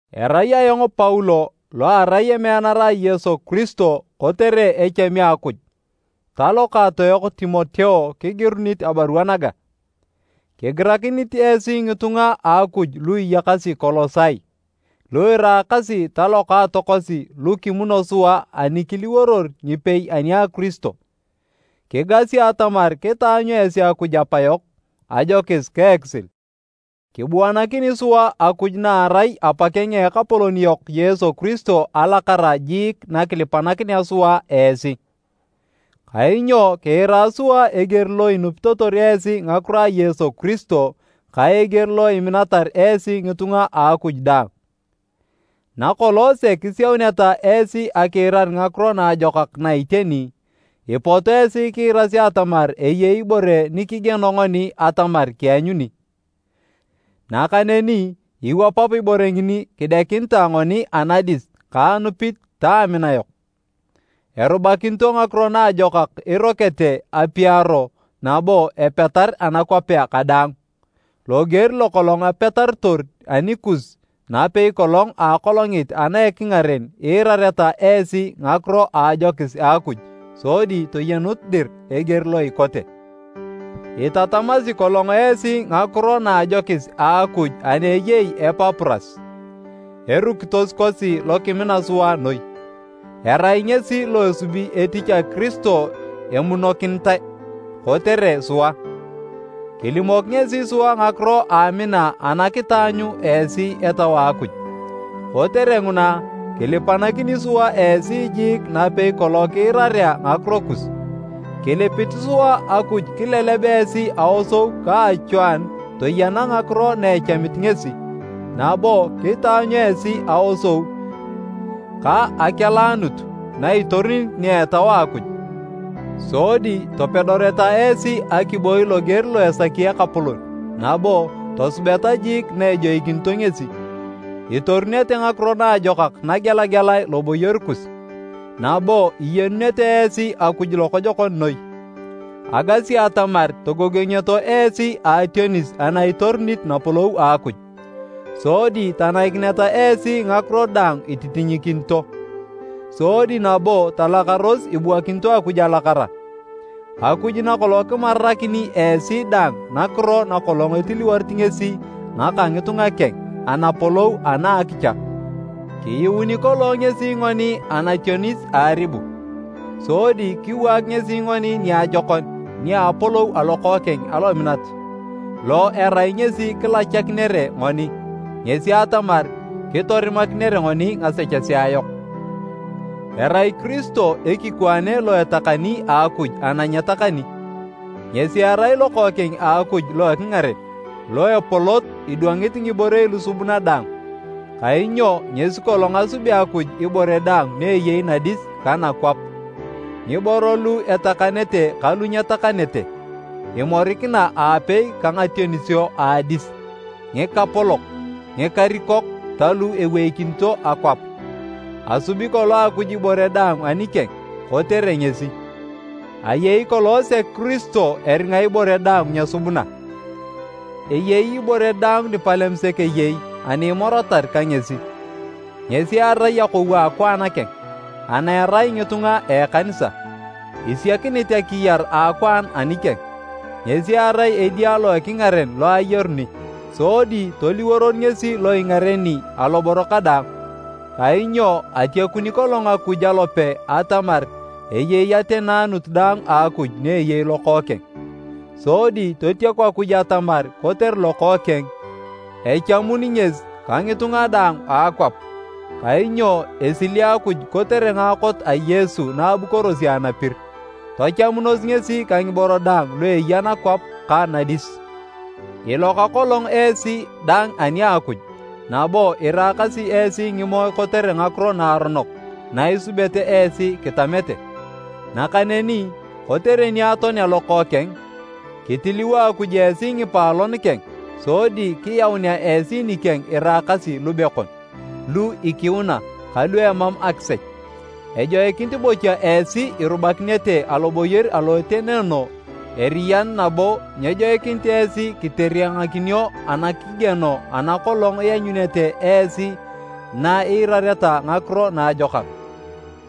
Erai ayong Paulo lo arai emeanara a Yesu Kiristo kotere echami a Akuj, ta lokaatoyok Timoteo kigirunit abarua naga. Kigirakinit esi ngitunga a Akuj lu iyakasi Kolosai, lu iraakasi ta lokaatokosi lu kimuno sua ani kiliworor ngipei ani a Kiristo. Kigasi atamar kitaanyu esi Akuj Apayok ajokis ka ekisil. Kibuanakini sua Akuj na erai Apakeng a Ekapolon yok Yesu Kiristo alakara jiik nakilipanakinea sua esi. Kainyo kiira sua eger lo inupitotor esi ngakiro a Yesu Kiristo ka eger lo iminatar esi ngitunga a Akuj daang. Nakolong sek isiauneta esi akiirar Ngakiro Naajokak na iteni, ipot esi kiirasi atamar eyei ibore nikigieno ngoni atamar kianyuni. Nakaneni iwapap ibore ngini kidekinitae ngoni anadis ka anupit ta amina yok. Erubakinito Ngakiro Naajokak irokete apiaro nabo epetar anakwapea kadaang, loger lokolong apetarotor anikus napei kolong a akolongit ana a ekingaren iirareta esi ngakiro a ajokis a Akuj sodi toyenut dir eger lo ikote. Itatamasi kolong esi ngakiro na a ajokis a Akuj ani eyei Epapuras, erukitos kosi lokimina sua noi. Erai ngesi lo esubi etich a Kiristo emunokinitae, kotere sua. Kilimok ngesi sua ngakiro a amina ana kitaanyu esi Etau a Akuj. Kotere nguna, kilipanakini sua esi jiik napei kolong kiirarea ngakiro kus. Kilipit sua Akuj kileleb esi aosou ka achwaanu toyena ngakiro na echamit ngesi, nabo kitaanyu esi aosou ka akeleanut na itorunit nia a Etau a Akuj. Sodi topedoreta esi akiboi loger lo esaki Ekapolon nabo tosubeta jiik na ejoikinito ngesi. Itorunete ngakiro naajokak nagelagelae loboyor kus, nabo iyenunete esi Akuj lokojokon noi. Agasi atamar togogongioto esi a ationis ana itorunit napolou a Akuj, sodi tanaikineta esi ngakiro daang ititinyikinito. Sodi nabo talakaros ibuakinito Akuj alakara. Akuj nakolong kimarakini esi dang nakiro nakolong etiliworit ngesi ngaka ngitunga keng, Anapolou ana a akicha. Kiyuuni kolong ngesi ngoni anationis a aribu, sodi kiwaak ngesi ngoni niajokon nia a apolou a lokookeng alominat, lo erai ngesi kilachakinere ngoni, ngesi atamar, kitorimakinere ngoni ngasechesea yok. Erai Kiristo ekikwaane lo etakani a Akuj ana nyetakani. Ngesi erai Lokookeng a Akuj lo ekingaren, lo epolot idwangit ngiborei lusubuna daang. Kainyo ngesi kolong asubea Akuj ibore daang ni eyei nadis ka nakwap, ngiboro lu etakanete ka lu nyetakanete, imorikina aapei ka ngationisio a adis, ngikapolok, ngikarikok ta lu eweikinito akwap. Asubi kolong Akuj ibore daang anikeng, kotere ngesi. Ayei kolong sek Kiristo eringa ibore daang nyesubuna. Eyei ibore daang nipalem sek eyei ani imoratar ka ngesi. Ngesi erai akou a akwaan keng, ana erai ngitunga a ekanisa, isiakinit akiyar a akwaan anikeng. Ngesi erai Edia lo ekingaren lo ayaruni, sodi toliworor ngesi lo ingareni aloboro kadaang. Kainyo atiakuni kolong Akuj alope atamar eyei ateneanut daang a Akuj ni eyei Lokookeng. Sodi totiaku Akuj atamar kotere Lokookeng, echamun ngesi ka ngitunga daang a akwap, kainyo esili Akuj kotere ngaakot a Yesu na abukorosi anapir, tachamunos ngesi ka ngiboro daang lu eya nakwap ka nadis. Iloka kolong esi dang ani a Akuj nabo iraakasi esi ngimoe kotere ngakiro naaronok na isubete esi kitamete. Nakaneni, kotere ni atoanea Lokookeng, kitiliwo Akuj esi ngipaalon keng sodi kiyaunea esi nikeng iraakasi lubekon, lu ikiuna ka lu emam akisech. Ejoikinit bocha esi irubakinete aloboyor alo etenoono eriyan nabo nyejoikinit esi kiteriangakinio anakigieno ana kolong ianyunete esi na iirareta Ngakiro Naajokak.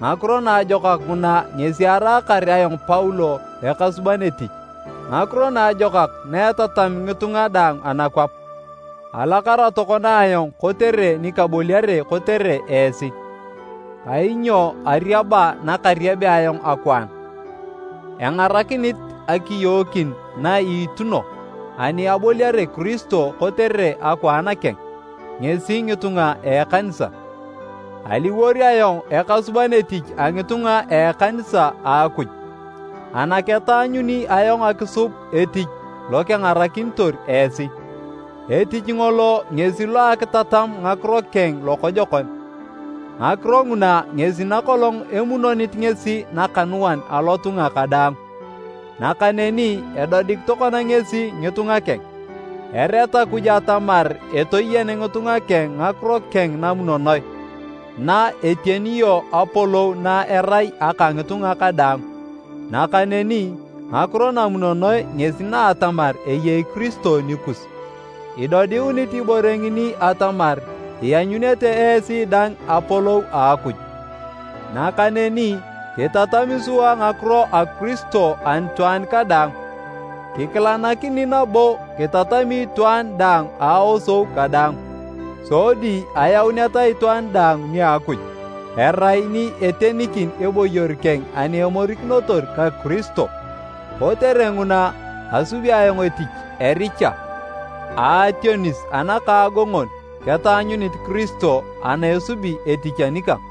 Ngakiro Naajokak nguna ngesi araakar ayong Paulo ekasuban etich, Ngakiro Naajokak na etatam ngitunga daang anakwap. Alakara tokona ayong kotere ni kaboliare kotere esi. Kainyo ariaba nakariabea ayong akwaan, engarakinit akiyookin na iituno ani aboliare Kiristo kotere akwaan keng, ngesi ngitunga a ekanisa. Aliwor ayong ekasuban etich a ngitunga a ekanisa a Akuj, ana ketaanyuni ayong akisub etich lo kengarakinitor esi. Etich ngolo ngesi lo a akitatam ngakiro keng lokojokon, ngakiro nguna ngesi nakolong emunonit ngesi nakanuan alotunga kadaang, nakaneni edodik tokona ngesi ngitunga keng. Ereat Akuj atamar etoyen ngitunga keng ngakiro keng namunonoe na etionio apolou na erai aka ngitunga kadaang. Nakaneni ngakiro namunonoe ngesi na atamar eyei Kiristo nikus, idodiunit ibore ngini atamar ianyunete esi dang apolou a Akuj. Nakaneni kitatami sua ngakiro a Kiristo anitwaan kadaang. Kikilanakini nabo kitatami itwaan daang a aosou kadaang, sodi ayauneta itwaan daang nia Akuj erai ni etenikin eboyor keng ani emorikinotor ka Kiristo. Kotere nguna, asubi ayong etich, ericha, a ationis anakaagongon ketaanyunit Kiristo ana esubi etich anikang.